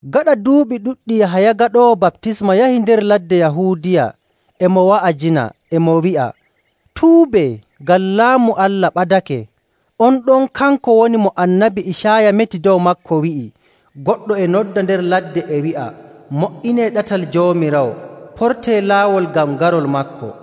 Gaɗa duuɓi ɗuɗɗi Yahaya Gaɗoowo Baptisma yahi nder ladde Yahuudiya, e mo wa'ajina, e mo wi'a, “Tuubee, ngam Laamu Allah ɓadake!”. On ɗon kanko woni mo Annabi Icaaya meti dow maako, wi'i, “Goɗɗo e nodda nder ladde, e wi'a, ‘Mo''inee ɗatal Joomiraawo, portee laawol ngam garol maako!’”.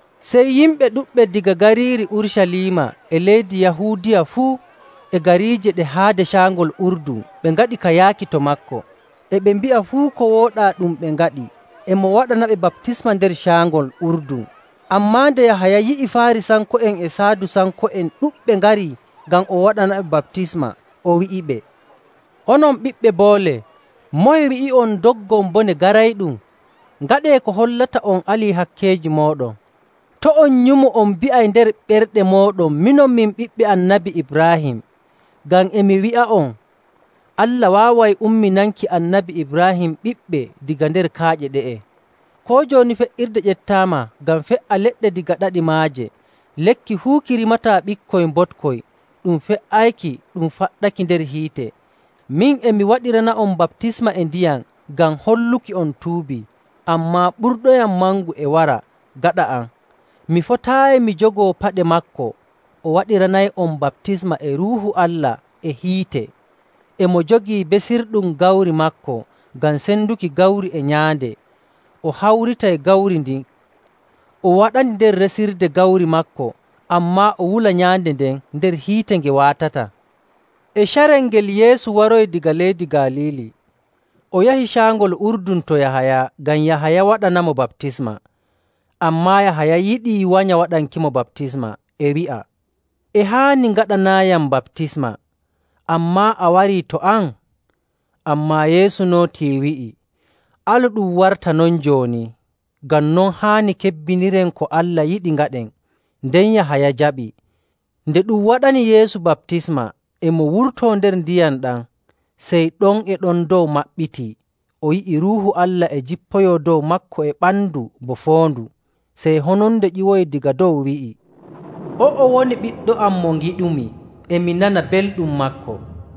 Sey yimɓe ɗuɗɓe daga gariiri Urucaliima e leydi Yahuudiya fuu e gariije ɗe haade Caangol Urdun ɓe ngaɗi ka yaaki to maako. E ɓe mbi'a fuu ko wooɗaa ɗum ɓe ngaɗi, e mo waɗanaɓe baptisma nder Caangol Urdun. Ammaa nde Yahaya yi'i Faarisanko'en e Saadusanko'en ɗuɗɓe ngari ngam o waɗanaɓe baptisma, o wi'iɓe, “Onon ɓiɓɓe boole! Moye wi'i'on ndoggon bone garayɗum?. Ngaɗee ko hollata on ali hakkeeji mooɗon. To' on nyumu on mbi'ay nder ɓerɗe mooɗon, ‘Minon, min ɓiɓɓe Annabi Ibraahim.’ Ngam e mi wi'a'on, Allah waaway umminanki Annabi Ibraahim ɓiɓɓe daga nder kaaƴe ɗe'e.. Koo jooni fe''irde ƴeftaama ngam fe''a leɗɗe daga ɗaɗi maaje. Lekki fuu ki rimataa ɓikkoy mboɗkoy, ɗum fe''ayki ɗum faɗɗaki nder hiite.. Min, e mi waɗirana'on baptisma e ndiyam ngam holluki on tuubi. Ammaa ɓurɗoyam mangu e wara gaɗa am. Mi fotaayi mi jogoo paɗe maako. O waɗiranay'on baptisma e Ruuhu Allah e hiite. E mo jogii besirɗum gawri maako ngam senduki gawri e nyaande. O hawritay gawri ndin, o waɗandi nder resirde gawri maako, ammaa o wula nyaande nden nder hiite nge waatataa.” E carel ngel Yeesu waroyi daga leydi Galiili. O yahi Caangol Urdun to Yahaya ngam Yahaya waɗanamo baptisma. Ammaa Yahaya yiɗii wanya waɗankimo baptisma, e wi'a, “E haani ngaɗanaayam baptisma, ammaa a wari to am?” Ammaa Yeesu nootii wi'i, “Alu ɗum warta non jooni, ngam non haani kebbiniren ko Allah yiɗi ngaɗen.” Nden Yahaya jaɓi. Nde ɗum waɗani Yeesu baptisma, e mo wurto nder ndiyam ɗam, sey ɗon e ɗon dow maɓɓitii o yi'i Ruuhu Allah e jippoyo dow maako e ɓandu bo foondu. Sey hononde ƴiwoyi daga dow wi'i, “O'o woni Ɓiɗɗo am mo ngiɗumi, e mi nana belɗum maako.”.